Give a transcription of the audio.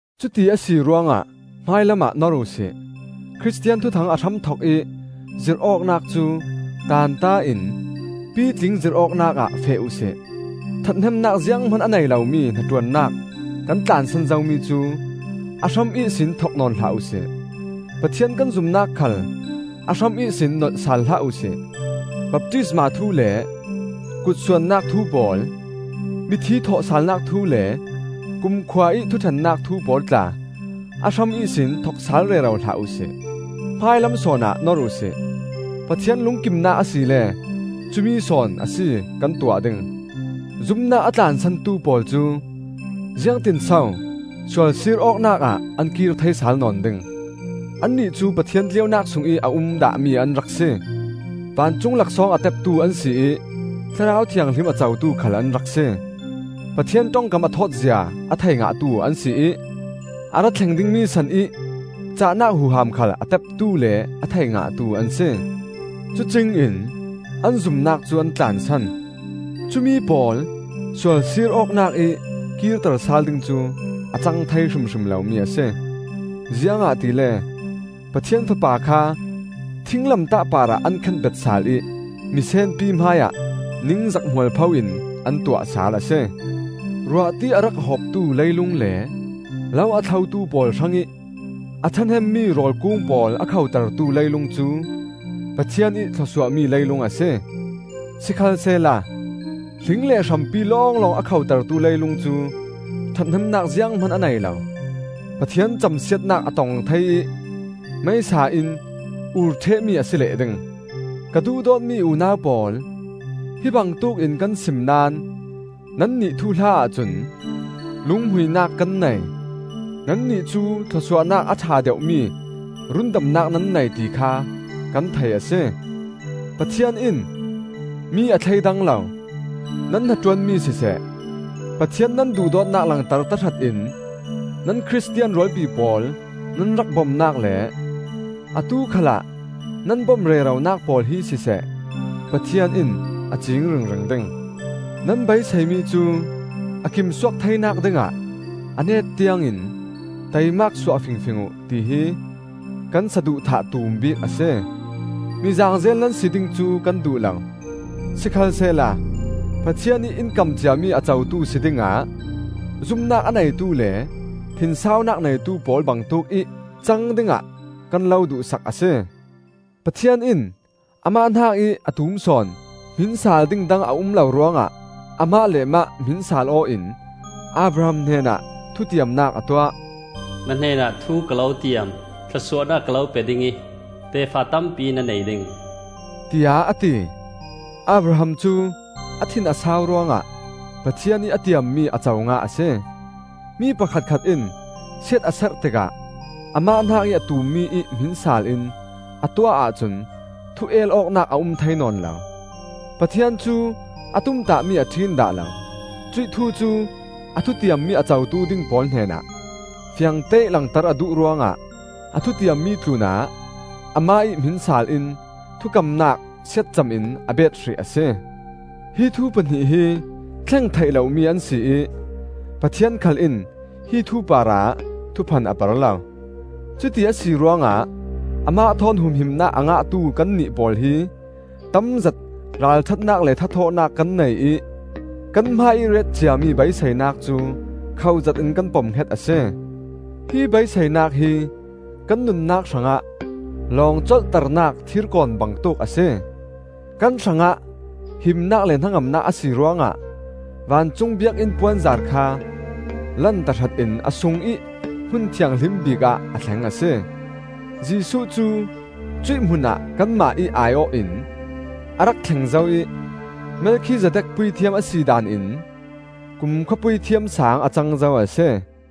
Cuti a si ruangah hmailamah nor uhsi; Khristian thuthang a hramthokih zirh awknak cu tanta in pitling zirh awknak ah feh uhsi. Ṭhathnemnak zianghman a nei lomi hnaṭuannak kan tlansan zomi cu a hram ihsin thok nawn hlah uhsi; Pathian kan zumnak khal a hram ihsin nolh sal hlah uhsi; baptisma thu le kutsuannak thu pawl, mithi thawhsalnak thu le kumkhua ih thuṭhennak thu pawl tla a hram ihsin thok sal rero hlah uhsi. Hmailam sawnah nor uhsi. Pathian lungkimnak asile cumi sawn a si kan tuah ding. Zumnak a tlansantu pawl cu ziangtinso sualsir awknak ah an kir thei sal nawn ding? Annih cu Pathian tleunak sungih a um dahmi an rak si; vancung laksawng a teptu an si ih Thlarau Thianghlim a cotu khal an rak si. Pathian ṭongkam a thawt zia a thei ngahtu an si ih a ra thleng dingmi sanih cahnak huham khal a teptu le a thei ngahtu an si. Cucingin an zumnak cu an tlansan! Cumi pawl sualsir awknak ih kirter sal ding cu a cang thei hrimhrim lomi a si; ziangahtile Pathian Fapa kha thinglamtah parah an khenbet sal ih misenpi hmaiah ningzak mualpho in an tuah sal a si. Ruahti a rak hawptu leilung le lo a thlotu pawl hrangih a ṭhahnemmi rawl kung pawl a khotertu leilung cu Pathian ih thluasuahmi leilung a si. Sikhalsehla hling le hrampi lawnglawng a khotertu leilung cu ṭhathnemnak zianghman a nei lo; Pathian camsiatnak a tong thei ih meisa in ur ṭhehmi a si leh ding. Ka duhdawtmi unau pawl, hi bangtuk in kan sim naón nannih thuhla ahcun lunghmuinak kan nei. Nannih cu thlawsuahnak a ṭha deuhmi rundamnak nan nei, ti kha kan thei a si. Pathian in mi a thleidang lo. Nan hnaṭuanmi siseh, Pathian nan duhdawtnak langter tahratin nan Khristian rualpi pawl nan rak bomnak le atu khalah nan bom reronak pawl hi siseh, Pathian in a ciing ringring ding. Nan beiseimi cu a kim suak theinak dingah a net tiangin taimak suah fingfing uh, tihi kan saduhthah tum bik a si. Mi zaangzel nan si ding cu kan duh lo; sikhalsehla Pathian ih in kam ciami a cotu si dingah zumnak a neitu le thinsaunak neitu pawl bangtuk ih cang dingah kan lo duhsak a si. Pathian in amah hnakih a tum sawn hmin saal ding dang a um lo ruangah amah le mah hmin saal-aw in Abraham hnenah thutiamnak a tuah. “Na hnenah thu ka lo tiam: thlawsuahnak ka lo pe ding ih tefa tampi na nei ding,” tiah a ti. Abraham cu a thin a sau ruangah Pathian ih a tiammi a co ngah a si. Mi pakhatkhat in siat a serh tikah amah hnakih a tummi ih hmin saal in a tuah ahcun thu el awknak a um thei nawn lo. Pathian cu a tumtahmi a ṭhin dah lo; cuih thu cu a thutiammi a cotu ding pawl hnenah fiangteih langter a duh ruangah a thutiammi tlunah amah ih hmin saal in thukamnak siatcam in a bet hrih a si. Hi thu pahnih hi thleng theih lomi an si ih Pathian khal in hi thu parah thuphan a per lo. Cuti a si ruangah amah thawn humhimnak a ngahtu kannih pawl hi tamzet ralṭhatnak le thathawhnak kan nei ih kan hmaiih ret ciami beiseinak cu khoh zetin kan pomhnget a si. Hi beiseinak hi kan nunnak hrangah lawng colhternak thirkawn bangtuk a si. Kan hrangah himnak le hnangamnak a si ruangah vancung biakinn puanzar kha lan tahratin a sungih hmun thianghlim bikah a thleng a si. Jesuh cu cuih hmunah kanmah ih ai-awh in a rak thleng zo ih Melkhizedek puithiam a si daan in kumkhua Puithiam Saang a cang zo a si.